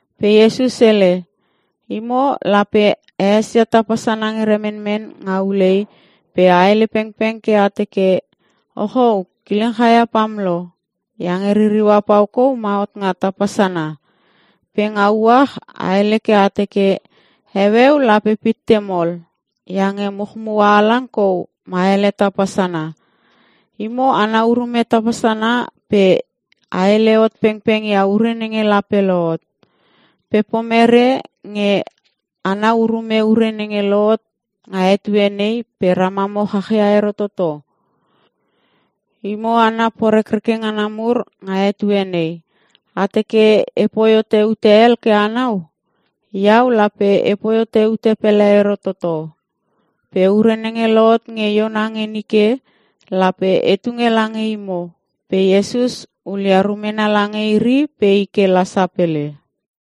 Pe Iesus hele, “Imo lape a esia tapa sana nge remenmen nga ulei pe a hele pengpeng ke a teke, ‘Ochou kileng chaia pam lo, iange ririua pau kou ma hot nga tapa sana.’ Pe nga uach a hele ke a teke, ‘Heueu lape pitte mol, iange muchmua halang kou ma hele tapa sana.’ Imo anau urume tapa sana pe a hele hot pengpeng ia ure nenge lape lohot. Pe pomere nge anau urume ure nenge lohotot nga etue nei pe ramamo chach ia ero toto? Imo hana porekreke ngana mur nga etue nei, a teke e poi hote ute hel ke anau? Iau lape e poi hote ute pele ero toto. Pe ure nenge lohot nge Iona nge nike, lape e tunge lange imo.” Pe Iesus hulia rumena lange iri pe i ke la sapele.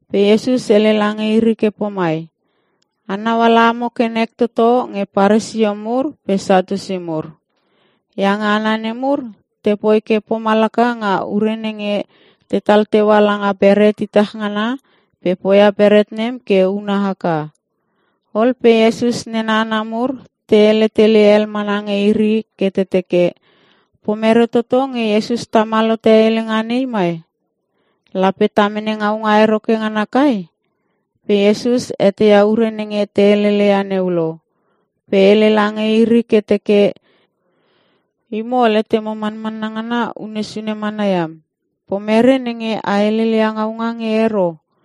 Pe Iesus hele lange iri ke pomai, “Anau ala amo ke nek toto nge Paresio mur pe Satiusi mur. Iange hana nemur, te poi ke pomalaka nga ure nenge tetal teua langa beret itach ngana pe poia beret nem ke una haka.(is)” Ol pe Iesus nena hana mur te hele tele hel mana nge iri ke te teke, “Pomere toto nenge Iesus tamal hote helenga nei mai? Lape ta mene ngaunga ero ke ngana kai?” Pe Iesus eteia ure nenge te heleleia neu lo, pe hele lange iri ke teke, “Imo letemo manmanna ngana unne sune mana iam. Pomere nenge a heleleia ngaunga nge ero?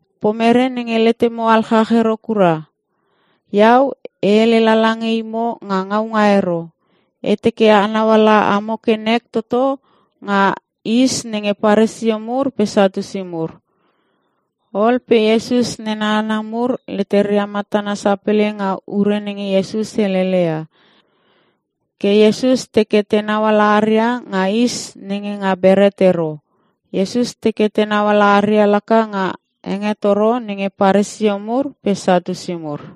Pomere nge letemo alchach ero kura? Iau e hele lala nge imo nga ngaunga ero. E teke anau ala amo ke nek toto nga is nenge Paresio mur pe Satiusi mur.” Ol pe Iesus nena hana mur leteria matana sapele nga ure nenge Iesus helele ia. Ke Iesus teke tenau ala aria nga is nenga beret ero. Iesus teke tenau ala aria laka nga hengetoro nenge Paresio mur pe Satiusi mur.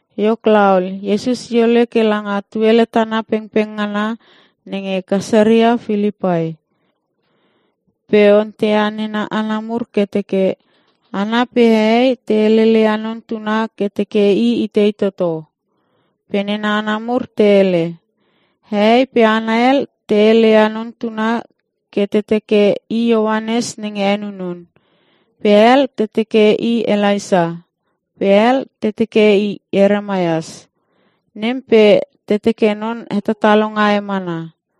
Iok laol, Iesus i ole ke langa tuele tana pengpeng ngana nenge Kaesarea Pilipai. Pe onteia nena hana mur ke teke, “Hana pe hehei te heleleia Non Tuna ke te teke I itei toto?” Pe nena hana mur te hele, “Hehei pe hana hel te heleia Non Tuna ke te teke, I Ioanes nenge henunun; pe hel te teke I Elaisa; pe hel te teke Ieremias; nem pe te teke non hetatalonga e mana.”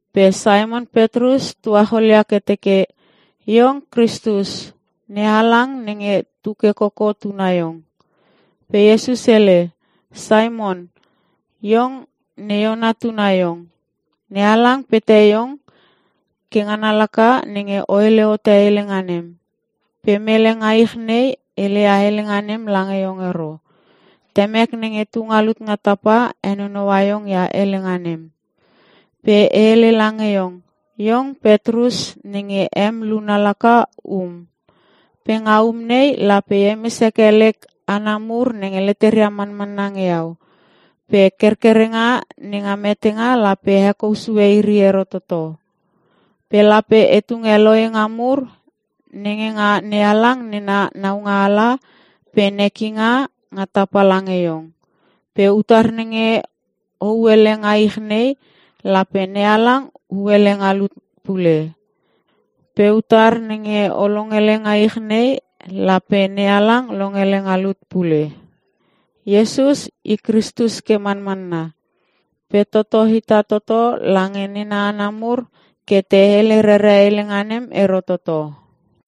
Pe Simon Petrus tuacholia ke teke, “Iong Kristus. NeHalang nenge tu ke koko tuna iong.” Pe Iesus hele, “Simon, iong ne Iona tuna iong. NeHalang pete iong. Ke ngana laka nenge o hele hote helenga nem. Pe mele nga ich nei hele ia helenga nem lange iong ero. Temek nenge tu nga lut nga tapa henonou iong ia helenga nem. Pe e hele lange iong, iong Petrus nenge em luna laka, ‘um’, pe nga um nei lape e hemes heke lek hana mur nenge leteria manmanna nge iau. Pe kerkerenga nenga metenga lape hekou sue iri ero toto. Pe lape e tunge lohenga mur nenga NeHalang nena naualanga pe nekinga nga tapa lange iong. Pe utar nenge o hu hele nga ich nei, lape NeHalang hu hele nga lut pule. Pe utar nenge o longele nga ich nei, lape NeHalang longele nga lut pule.” Iesus i Kristus ke manmanna. Pe toto hita toto lange nena hana mur ke te hele rere helenga nem ero toto.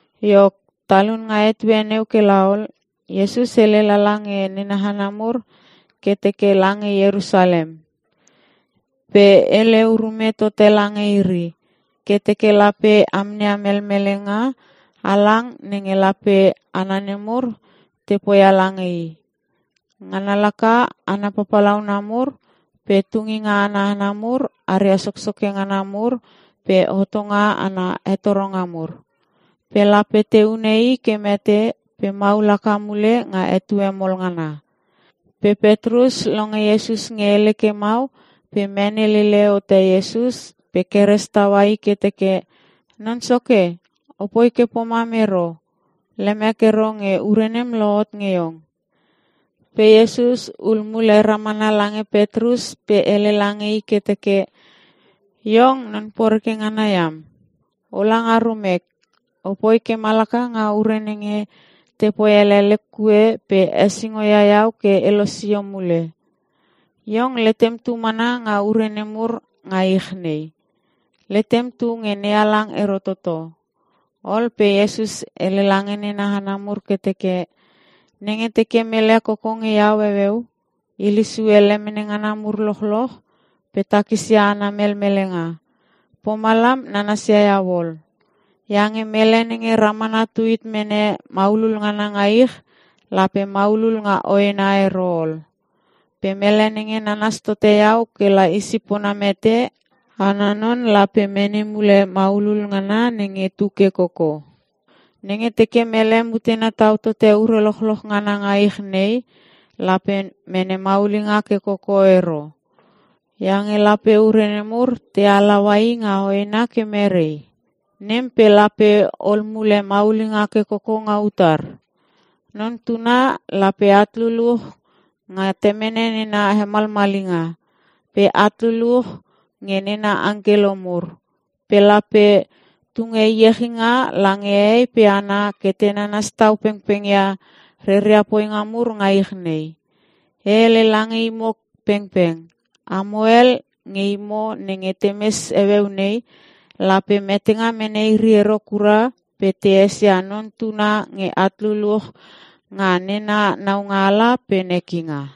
Iok, talun nga etue neu ke la ol, Iesus hele lala nge nena hana mur ke teke lange Ierusalem. Pe hele urume tote lange iri, ke teke lape amneia melmelenga halang nenge lape hana nemur te poia lange I. Ngana laka hana papalauna mur pe tunginga ana hana mur aria soksoke ngana mur pe hotonga ana hetoronga mur. Pe lape te hune I ke mete pe maul haka mule nga etue mol ngana. Pe Petrus longe Iesus nge hele ke mau pe mene lele hote Iesus pe keres taua I ke teke, “Non Soke! O poi ke pomam ero. Lemek ero nge ure nem lohot nge iong.” Pe Iesus ul mule ramana lange Petrus pe hele lange i ke teke, “Iong non poreke ngana iam, o la nga rumek! O poi ke malaka nga ure nenge teke poi hele lek kue pe hesingo ia Iau ke e losio mule. Iong letem tu mana nga ure nemur nga ich nei. Letem tu nge NeHalang ero toto.” Ol pe Iesus hele lange nena hana mur ke teke, “Nenge teke mele koko nge Iau heueu, hilesue lemene ngana mur lochloch pe takisia ana melmelenga, pomalam nanasia iau ol. Iange mele nenge ramana tuhit mene maulul ngana nga ich, lape maulul nga hoena ero ol. Pe mele nenge nanas tote iau kela i sipona mete, ana non lape mene mule maulul ngana nenge tu ke koko. Nenge teke mele mutena tau tote ure lochloch ngana nga ich nei, lape mene maulinga ke koko ero. Iange lape ure nemur te halaua i nga hoena ke merei? Nem pe lape ol mule maulinga ke koko nga utar? Non Tuna lape at luluch nga Temene na hemalmalinga. Pe at luluch nge nena angkelo mur. Pe lape tunge iechinga lange hehei pe hana ke nanas tau pengpengia reria poinga mur nga ich nei. E hele lange imo pengpeng, amo hel nge imo nenge te mes heueu nei, lape metenga mene iri ero kura pe te esia Non Tuna nge at luluch nga nena naualanga pe nekinga.”